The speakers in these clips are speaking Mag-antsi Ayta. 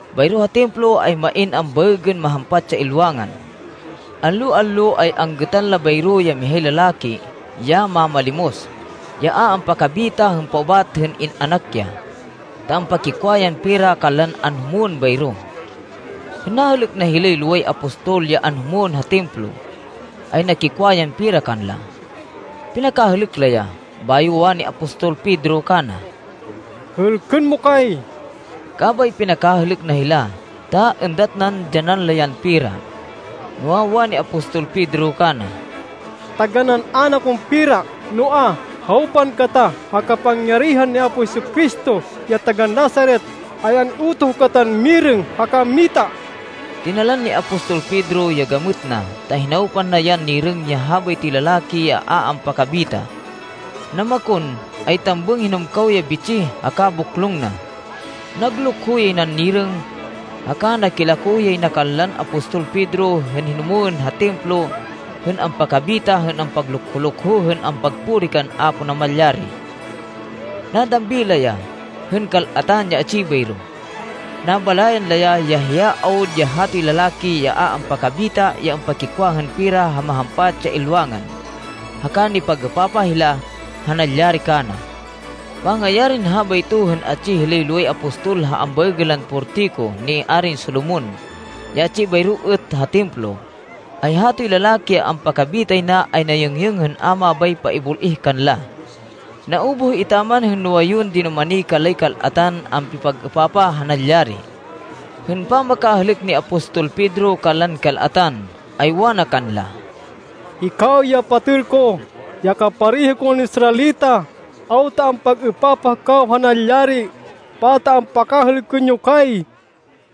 Bayro ha Templo, ay main ambaêgên Mahampat ya Ilwangan. Allo-allo ay anggêtan la bayro ya mihay lalaki, ya mamalimos, ya a ampakabita hên paubat hên in-anak ya, ta ampakikwa yan pera kanlan anhumwên bayro. Hên nahêlêk na hilay loway apostol ya anhumwên ha Templo, ay nakikwa yan pera kanla. Pinakahêlêk la ya, bayo wani apostol Pedro kana, “Hêlkên mo kay!” Kabay pinakahêlêk na hila ta êndat nan dyanan la yan pera. Noa, wani apostol Pedro kana, “Taganán ayn akon pera, noa, hawpan kata. Ha kapangyarihan ni Apo Jesu-Cristo, ya taga-Nazaret, ay an-iutoh katan mirêng haka mita!” Tinalan ni apostol Pedro ya gamêt na ta hinawpan na yan nirêng ya habaytoy lalaki ya a ampakabita. Namakon, ay tambêng hinumkaw ya bitsih haka boklong na. Naglukho yay nan nirêng, haka nakilako yay na kanlan apostol Pedro hên hinumwên ha Templo hên ampakabita hên paglukho-lukho hên ampagpuri kan Apo Namalyari. Nadambi la ya, hên kal-atan ya atsi bayro. Nabalayan la ya, ya hiya awud ya hatoy lalaki ya a ampakabita ya ampakikwa hên pera ha Mahampat ya Ilwangan, haka nipag-êpapah hila ha nalyari kana. Pangayarin habayto, hên atsi hilay loway apostol ha ambaêgên lan Portiko ni Arin Solomon ya atsi bayro êt ha Templo, ay hatoy lalaki ya ampakabitay na ay nayêngyêng hên a mabay paibul-ih kanla. Naubuh etaman hên nuwayun dinumani kanlay kal-atan ampipag-êpapah ha nalyari. Hên pamakahêlêk ni apostol Pedro kanlan kal-atan, ay wana kanla, “Hikaw ya patêl ko, ya kapareho kon Israelita, awta ampag-êpapah kaw ha nalyari? Pata ampakahêlkên yo kay?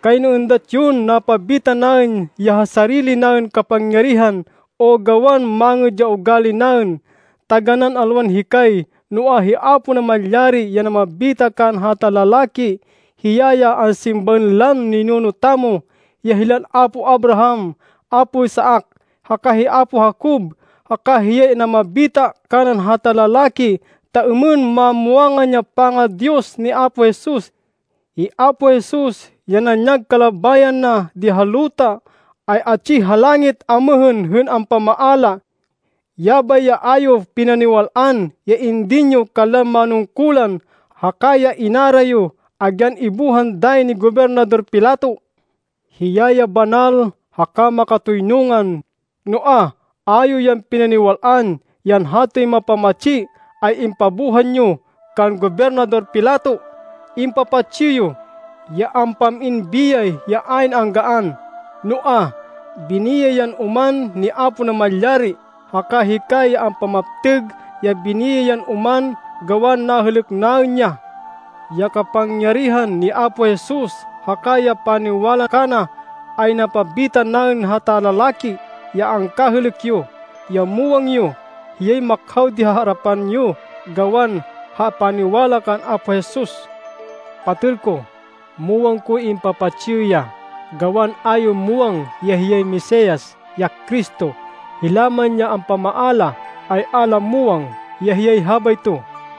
Kayno êndat yon napabita naên ya ha sarili naên kapangyarihan o gawan mangêd ya ugali naên! Taganán alwan hikay, noa, hi Apo Namalyari ya namabita kanan hata lalaki. Hiya ya ansimbaên lan ninuno tamo, ya hilan apo Abraham, apo Isaac haka hi apo Jacob, haka hiya ya namabita kanan hata lalaki, ta êmên mamwangan ya panga-Diyos ni Apo Jesus. Hi Apo Jesus ya nanyag kalabayan na di ha luta, ay atsi ha langit amêhên hên ampamaala. Yabay ya a yo pinaniwal-an, ya indin yo kanlan manungkulan, haka ya inara yo, agyan ibuhan ya dayi ni Gobernador Pilato. Hiya ya Banal haka Makatoynungan, noa, a yo yan pinaniwal-an, yan hatoy mapamatsi, ay impabuhan yo kan Gobernador Pilato! Impapatsi yo, ya ampam-in biyay ya ayn anggaan, noa, biniyay yan oman ni Apo Namalyari, haka hikay ya ampamaptêg ya biniyay yan oman gawan nahêlêk naên ya. Ya kapangyarihan ni Apo Jesus haka ya paniwala kana, ay namabita kanan hata lalaki ya angkahêlêk yo, ya muwang yo. Hiyay makhaw di ha arapan yo gawan ha paniwala kan Apo Jesus. “Patêl ko, muwang koy impapatsi yo ya, gawan a yo muwang ya hiyay Mesias, ya Cristo. Hila man ya ampamaala, ay a la muwang ya hiyay habayto.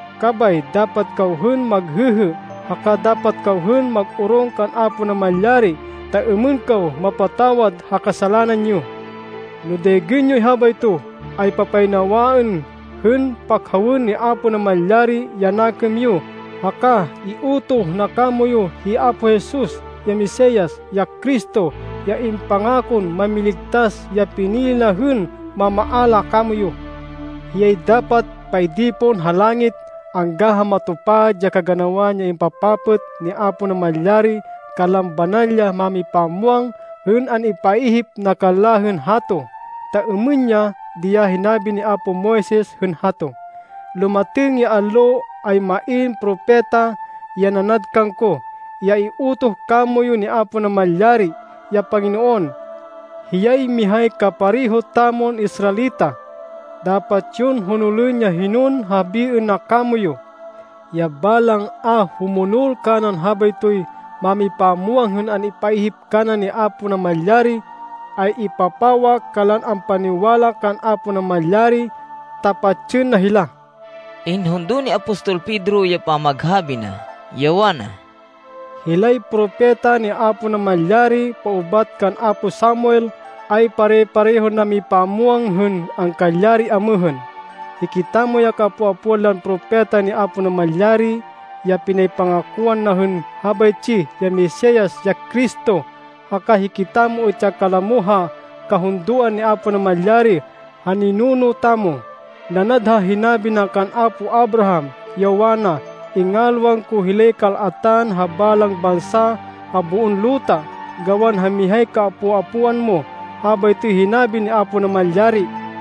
Kabay dapat kaw hên maghêhê, haka dapat kaw hên mag-orong kan Apo Namalyari ta êmên kaw mapatawad ha kasalanan yo. No daygên yoy habayto, ay papaynawaên hên pakhawên ni Apo Namalyari ya nakêm yo haka iutoh na kamoyu hi Apo Jesus, ya Mesias, ya Cristo, ya impangakon Mámiligtas ya pinili na hên mamaala kamoyu. Hiyay dapat paidi pon ha langit angga ha matupad ya kaganawan ya impapapêt ni Apo Namalyari kanlan banal ya mámipamwang hên an-ipaihip na kanla hên hato. Ta êmên ya di ya hinabi ni apo Moises hên hato, ‘Lumatêng ya allo ay main propeta, ya nanad kangko, ya iutoh kamoyu ni Apo Namalyari, ya Panginoon. Hiyay mihay kapareho tamon Israelita. Dapat yon honolên ya hinon habiên na kamoyu. Ya balang a humonol kanan habaytoy mámipamwang hên an-ipaihip kana ni Apo Namalyari, ay ipapawa kanlan ampaniwala kan Apo Namalyari ta patsên na hila.’” Inhundo ni apostol Pedro ya pamaghabi na, ya wana, “Hilay propeta ni Apo Namalyari paubat kan apo Samuel ay pare-parehon namipamwang hên angkalyari amêhên. Hikitamo ya kaapo-apoan lan propeta ni Apo Namalyari, ya pinaypangakoan na hên habaytsi ya Mesias, ya Cristo. Haka hikitamo êt ya kalamo ha kahundoan ni Apo Namalyari ha ninuno tamo. Nanad ha hinabi na kan apo Abraham, ya wana, ‘Ingalwan ko hilay kal-atan ha balang bansa ha boon luta gawan ha mihay kaapo-apoan mo. Habaytoy hinabi ni Apo Namalyari.’”